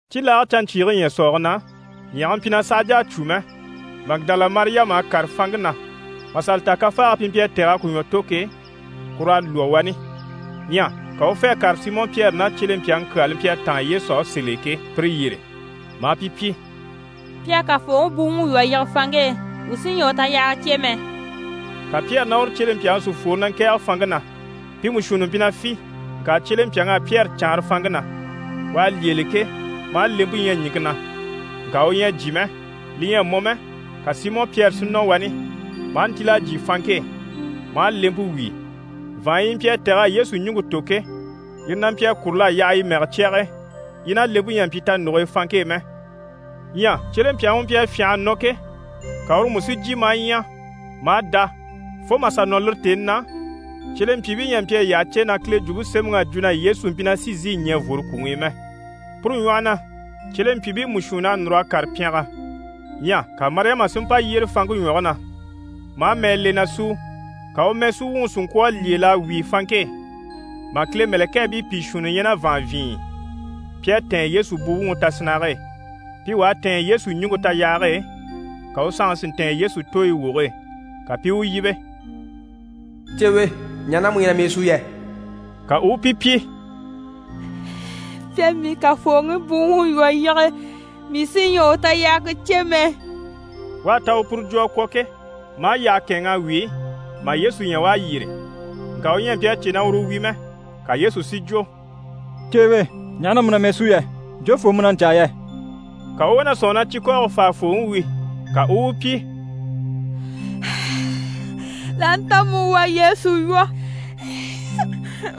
Cibilaage canɲcyiige ɲyɛ̀sɔɔge na, ɲyɛge mpyi na sàha jà a cwó mɛ, Magidala Mariyama à kàre fanŋke na mà sà li ta kafaage pi mpyi a tɛ̀g'a ku ɲwɔ tò ke, kur'à lwɔ́ wani. Ɲyɛ ka u u fê a kàre Simɔ Pyɛri ná cyelempyaŋi kyaa li mpyi a táan Yesu á sèl'e ke, pire yyére, maa pi pyi: «Pi à Kafooŋi buwuŋi lwɔ́ a yige fanŋke e, wuu sí ɲyɛ a u tayahaga cè mɛ.» Ka Pyɛri ná uru cyelempyaŋi si fworo na ŋkɛ̀ɛge fanŋke na. Pi mú shuunni mpyi na fî, ŋka cyelempyaŋ'à Pyɛri caanra fanŋke na. U à lyêele ke, maa lempe ɲya ɲìŋke na, ŋka u ɲyɛ a jyè mɛ. Li ɲyɛ a mɔ mɛ, ka Simɔ Pyɛri si nɔ wani, maa ntíl'a jyè fanŋke e, maa lempe wíi. Vàanɲyi yi mpyi a tɛ̀g'a Yesu ɲùŋke tò ke, yire na mpyi a kúrul'a yaha yi mɛgɛ cyage e, yi ná lempe ɲyɛ a mpyi tanuge e fanŋke e mɛ. Ɲyɛ cyelempyaŋi u mpyi a fyânha a nɔ ke, ka uru mú si jyè maa ɲya, maa dá. Fo mà sà nɔ lire tèni na, cyelempyiibii ɲyɛ a mpyi a yi yyaha cè na Kile Jwumpe Semɛŋi à jwo na Yesu mpyi na sí n‑sìi ɲɛ̀ n‑fworo kwùŋi i mɛ. Puru ɲwɔhɔ na, cyelempyiibii mú shuunn'à núr'a kàre pyɛngɛ. Ɲyɛ ka Mariyama si mpa yyére fanŋke ɲwɔge na, maa mɛɛ le na súu. Ka u mɛɛsuwuŋi si ŋkwɔ̀ a lyêel'a wíi fanŋke e, mà Kile mɛ̀lɛkɛɛbii pìi shuunni ɲya ná vàanvyinɲyi i, pi à tɛ̀ɛn Yesu buwuŋi tasinnage e. Pi wà à tɛ̀ɛn Yesu ɲùŋke tayahage e, ka u sanŋi si ntɛ̀ɛn Yesu tooyi woge e. Ka pi i u yíbe: «Ceewe, ɲaha na mu na mɛɛ súu yɛ?» Ka u u pi pyi: «Pi à mii Kafooŋi buwuŋi lwɔ́ a yige, mii sí ɲyɛ a u tayahaga cè mɛ.» U à ta u puru jwo a kwɔ̀ ke, maa yyaha kɛ̂ɛnŋ'a wíi mà Yesu ɲya u à yyére, ŋka u ɲyɛ a mpyi a cè na uru wi mɛ. Ka Yesu si jwo: «Ceewe, ɲaha na mu na mɛɛ súu yɛ? Jofoo mu na ɲcaa yɛ?» Ka u u wá na sɔ̂nŋi na cikɔɔge faafooŋi wi, ka u u u pyi: «L'aha nta mu u à Yesu lwɔ́,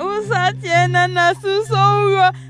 u saha cyêe na na si sà u lwɔ́.»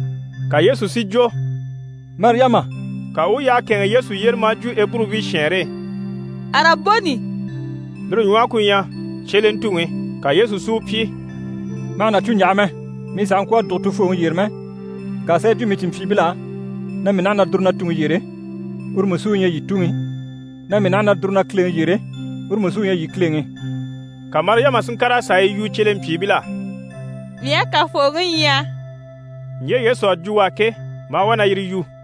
Ka Yesu si jwo: «Mariyama!» Ka u u yyaha kɛ̂ɛnŋɛ Yesu yyére maa jwo Eburubii shɛɛnre e: «Araboni!» Lire ɲwɔhe ku ɲyɛ: «Cyelentuŋi!» Ka Yesu si u pyi: «Ma hà na cû n‑yaha mɛ, mii sàha ŋkwɔ̀ a dùgo Tufooŋi yyére mɛ, ŋka sà yi jwo mii cìnmpyiibil'á na mii naha na dùru na Tuŋi yyére, uru mú sí u ɲyɛ yii Tuŋi, na mii naha na dùru na Kileŋi yyére, uru mú sí u ɲyɛ yii Kileŋi.» Ka Mariyama si ŋkàr'a sà a yi yu cyelempyiibil'á: «Mii à Kafooŋi ɲya!» Ɲje Yesu à jwo u á ke, maa wá na yire yu.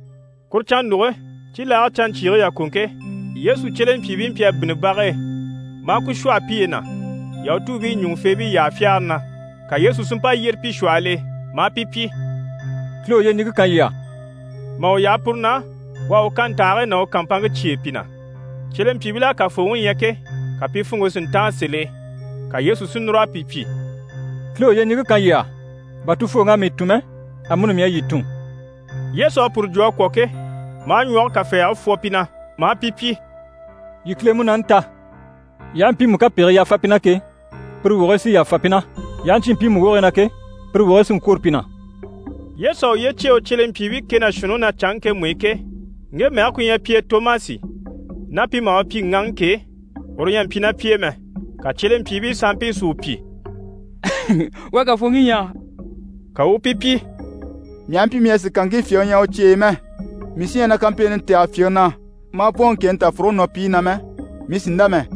Kuru cannuge, cibilaage canɲcyiige yàkoŋke, Yesu cyelempyiibii mpyi a bínni bag'e, maa ku shwɔ̂hɔ piye na Yahutuubii ɲùŋufeebii yyaha fyagare na. Ka Yesu si mpa yyére pi shwɔhɔl'e maa pi pyi: «Kile u yyeɲiŋke kan yii á.» Mà u yaha puru na, u à u kantahigii ná u kàmpanŋke cyêe pi na. Cyelempyiibil'à Kafooŋi ɲya ke, ka pi funŋke si ntáan sèl'e. Ka Yesu si núr'a pi pyi: «Kile u yyeɲiŋke kan yii á! Bà Tufooŋi à mii tun mɛ, amuni mii à yii tun.» Yesu à puru jwo a kwɔ̀ ke, maa ɲwɔge kafɛɛge fwɔ pi na, maa pi pyi: «Yii Kile Munaani ta.» Yii aha mpiimu kapegigii yàfa pi na ke, pire wogigii sí n‑yàfa pi na, yii aha ɲcyé mpiimu wogigii na ke, pire wogigii sí n‑kwôro pi na. Yesu à uye cyêe u cyelempyiibii kɛ ná shuunniŋi na canŋke ŋkemu i ke, ŋge mɛge ku ɲyɛ pi e Tomasi ná pi maha u pyi: «Ŋaŋi» ke, uru ɲyɛ a mpyi ná pi e mɛ. Ka cyelempyiibii sanmpii si u pyi: «Wuu à Kafooŋi ɲya!» Ka u u pi pyi: «Mii aha mpyi mii ɲyɛ a sìkanŋkii fyèŋi ɲya u cyeyi i mɛ, mii sí ɲyɛ a na kampeeni tɛ̀gɛ fyèŋi na, maa bwɔ̀n u ŋkèni tafuruge nɔɔpiige na mɛ, mii sì n‑dá mɛ.»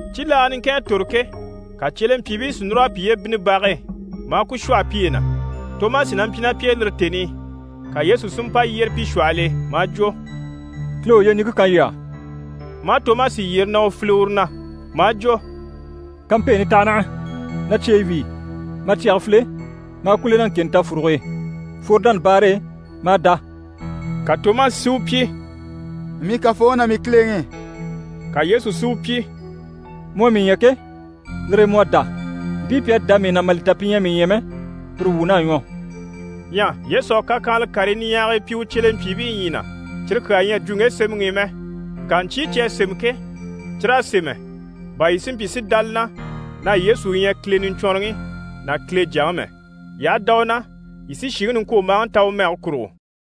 Cibilaaga niŋkin à tòro ke, ka cyelempyiibii si núr'a piye bínni bage e, maa ku shwɔ̂hɔ piye na, Tomasi na mpyi ná pi e lire tèni i, ka Yesu sí mpa yyére pi shwɔhɔl'e, maa jwo: «Kile u yyeɲiŋke kan yii á.» Maa Tomasi yyere na u file uru na, maa jwo: «Kampeeni taha naha, na cyeyi wíi, ma cyɛge file, maa ku le na ŋkèni tafuruge e. Fworo dánabaare e, ma a dá.» Ka Tomasi si u pyi: «Mii Kafooŋi ná mii Kileŋi!» Ka Yesu si u pyi: «Mu à mii ɲya ke, lire e mu à dá, mpii pi à dá mii na, mà li ta pi ɲyɛ a mii ɲya mɛ, pire wuun'à ɲwɔ.» Ɲyɛ Yesu à kakyanhala karii niɲyahagii pyi u cyelempyiibii ɲyii na, cyire kyaa ɲyɛ a jwo ŋge sémɛŋi i mɛ. Ŋka ɲcyii cyi à sémɛ ke, cyir'à sémɛ bà yii si mpyi si dá li na na Yesu u ɲyɛ Kile Niɲcwɔnrɔŋi ná Kile Jyaŋi mɛ. Yii aha dá u na, yii sí shìŋi niŋkwombaaŋi ta u mɛge kurugo.